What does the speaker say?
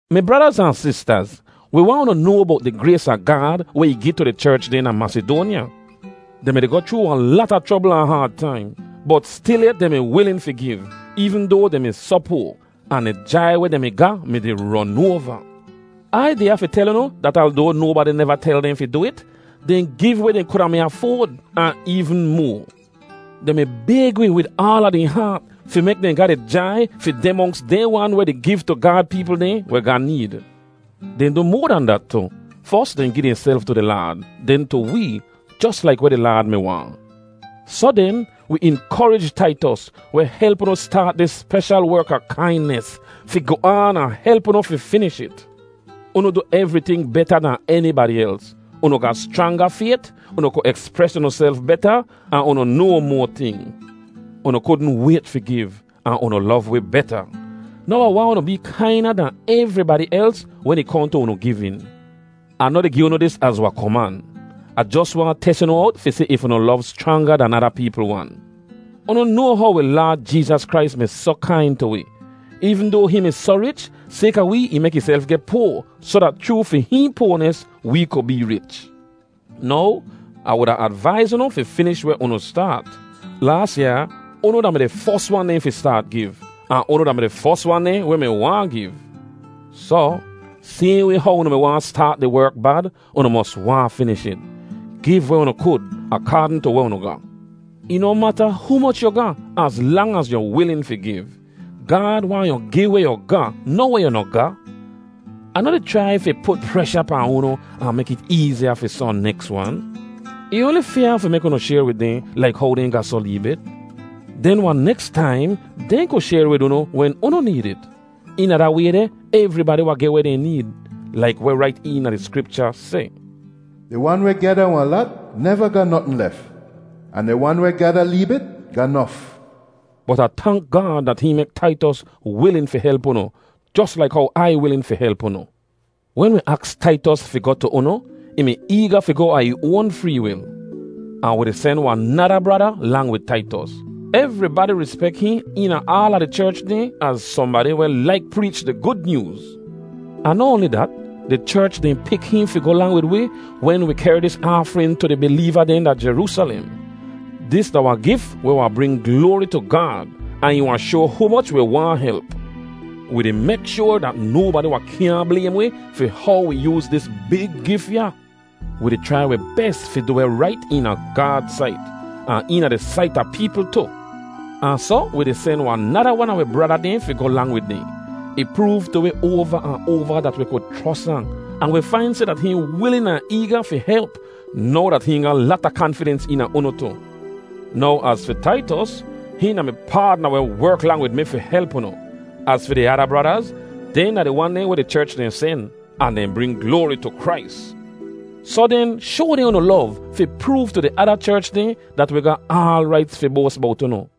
Mi bradaz ahn sistaz, wi waahn unu noa bowt di grays a Gaad weh ih gi tu di cherch dehn da Masidoanya. Dehn mi-di goh chroo wahn lata chrobl ahn haad taim, bot stilyet dehn mi wilin fi giv, eevn doa dehn mi soh poa, ahn di jai weh dehn mi ga mi-di ron oava. Ai deh ya fi tel unu dat aldoa nobadi neva tel dehn fi du it, dehn giv weh dehn kuda mi afoad, ahn eevn moa. Dehn mi bayg wi wid aala dehn haat fi mek dehn ga di jai fi deh monks dehn wan weh di giv tu Gaad peepl dehn weh ga need. Dehn du moa dan dat tu. Fos, dehn gi dehnself tu di Laad, den tu wee, jos laik weh di Laad mi waahn. Soh den, wi inkorij Taitos, weh help unu staat dis speshal werk a kainis, fi goh aan ahn help unu fi finish it. Unu du evriting beta dahn enibadi els—unu ga schranga fayt, unu ku ekspres unuself beta, ahn unu noa moa ting; unu kudn wayt fi giv, ahn unu lov wi beta. Now Ah waahn unu bee kaina dan evribadi els wen ih kohn tu unu givin. Ah noh di gi unu dis az wahn koman; Ah jos waahn tes unu owt fi si if unu lov schranga dan ada peepl wan. Unu noa how wi Laad Jeezas Krais mi soh kain tu wi; eevn doa hihn mi soh rich, sayka wee ih mek ihself geh poa soh dat chroo fi hihn poanis wee ku bee rich. Now, Ah wuda advaiz unu fi finish weh unu staat. Laas yaa, unu da-mi di fos wan dehn fi staat giv, ahn unu da-mi di fos wan dehn weh mi waahn giv. Soh, sayhn way how unu mi waahn staat di werk bad, unu mos waahn finish it. Giv weh unu kud akaadn tu weh unu ga. Ih noh mata humoch yu ga az lang az yu wilin fi giv. Gaad waahn yu gi weh yu ga, noh weh yu noh ga. Ah noh di chrai fi put presha pahn unu ahn mek it eeziya fi sohn neks wan. Ih oanli fyaa fi mek unu shayr wid dehn laik how dehn ga soh lee bit. Den wahn neks taim dehn ku shayr wid unu wen unu need it. Eena da way deh, evribadi wahn geh weh dehn need. Laik weh rait eena di Skripcha seh, “Di wan weh gyada wahn lat neva ga notn lef, ahn di wan weh gyada lee bit ga nof.” Bot Ah tank Gaad dat hihn mek Taitos wilin fi help unu jos laik how Ai wilin fi help unu. Wen wi aks Taitos fi goh tu unu, ih mi eega fi goh a ih oan free wil. Ahn wi di sen wahn nada brada lang wid Taitos. Evribadi rispek hihn eena aala di cherch dehn az sohnbadi weh laik preech di Gud Nyooz. Ahn noh oanli dat, di cherch dehn pik hihn fi goh lang wid wi wen wi kehr dis aafrin tu di bileeva dehn da Jeroosalem. Dis da wahn gif weh wahn bring gloari tu Gaad, ahn ih wahn shoa humoch wi waahn help. Wi di mek shoar dat nobadi wahn kyaahn blaym wi fi how wi yooz dis big gif ya. Wi di chrai wi bes fi du weh rait eena Gaad sait, ahn eena di sait a peepl tu. Ahn soh wi di sen wahn nada wan a wi brada dehn fi goh lang wid dehn. Ih proov tu wi oava ahn oava dat wi ku chros ahn, ahn wi fain seh dat hihn wilin ahn eega fi help now dat hihn ga lata kanfidens eena unu tu. Now az fi Taitos, hihn da mi paadna weh werk lang wid mi fi help unu; az fi di ada bradaz, dehn da di wan dehn weh di cherch dehn sen, ahn dehn bring gloari tu Krais. Soh den, shoa dehn unu lov fi proov tu di ada cherch dehn dat wi ga aal raits fi boas bowt unu.